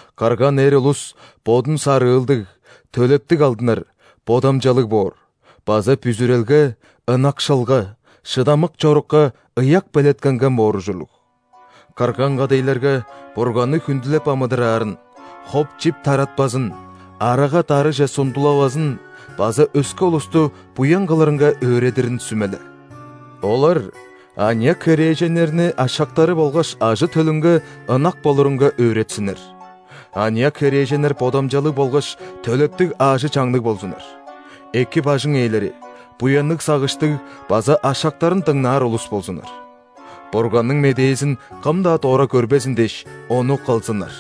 Кырган эр улус бодун сарыылдыг, төлептиг алдынар, бодамчалыг боор база бүзүрелге, ынакшылга, шыдамык чорукка ыяк белеткенген боор ужурлуг. Кырган кадайларга Бурганны хүндүлеп амыдыраарын, хоп-чип таратпазын, арага-дарыже сундулавазын база өске улусту буян кылырынга өөредирин сүмеле. Олар аныяк херээженнерни ашактары болгаш ажы-төлүнге ынак болурунга өөретсиннер. Аныяк херээженнер бодамчалыг болгаш төлептиг аажы-чаңныг болзуннар; эки бажың ээлери, буянныг сагыштыг база ашактарын дыңнаар улус болзуннар. Бурганның медээзин кым-даа дора көрбезин дээш, ону кылзыннар.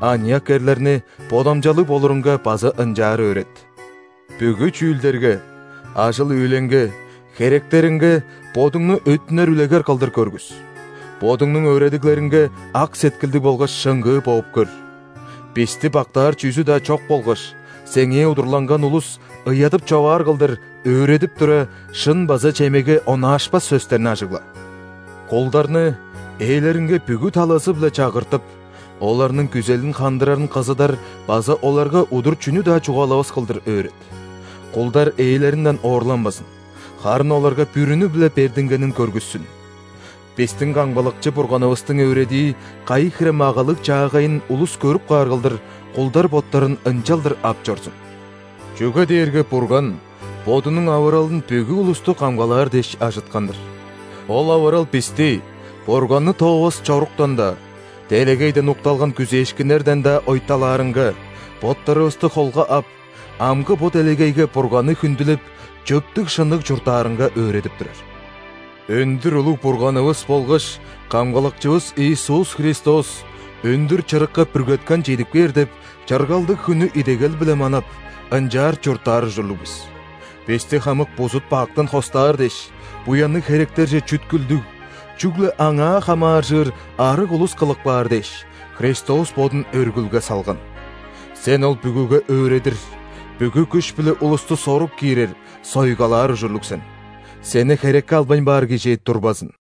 Аныяк эрлерни бодамчалыг болурунга база ынчаар өөрет. Бүгү чүүлдерге: ажыл-үүлеңге, херектериңге бодуңну өттүнер үлегер кылдыр көргүс, бодуңнуң өөредиглериңге ак сеткилдиг болгаш шыңгыы бооп көр. Бисти бактаар чүзү-даа чок болгаш, сеңээ удурланган улус ыядып-човаар кылдыр, өөредип тура, шын база чемеге онаашпас сөстерни ажыгла. Кулдарны ээлеринге бүгү талазы-биле чагыртып, оларның күзелин хандырарын кызыдар база оларга удур чүнү-даа чугаалавас кылдыр өөрет. Кулдар ээлеринден оорланмазын, харын оларга бүрүнү-биле бердингенин көргүссүн. Бистиң Камгалакчы Бурганывыстың өөредии кайы хире магалыг чаагайын улус көрүп каар кылдыр, кулдар боттарын ынчалдыр ап чорзун. Чүге дээрге Бурган Бодунуң авыралын бүгү улусту камгалаар дээш ажыткан-дыр. Ол авырал бисти Бурганны тоовас чоруктан-даа, делегейден укталган күзээшкиннерден-даа ойталаарынга; боттарывысты холга ап, амгы бо делегейге Бурганны хүндүлеп, чөптүг-шынныг чурттаарынга өөредип турар. Өндүр улуг Бурганывыс болгаш Камгалакчывыс Иисус Христос өндүр чырыкка бүргеткен чедип кээр деп, чыргалдыг хүннү идегел-биле манап, ынчаар чурттаар ужурлуг бис. Бисти хамык бузут-бактан хостаар дээш, буянныг херектерже чүткүлдүг, чүгле Аңаа хамааржыр, арыг улус кылып каар дээш, Христос Бодун өргүлге салган. Сен ол бүгүге өөредир, бүгү күш-биле улусту сорук киирер, сойгалаар ужурлуг сен. Сени херекке албайн баар кижи турбазын.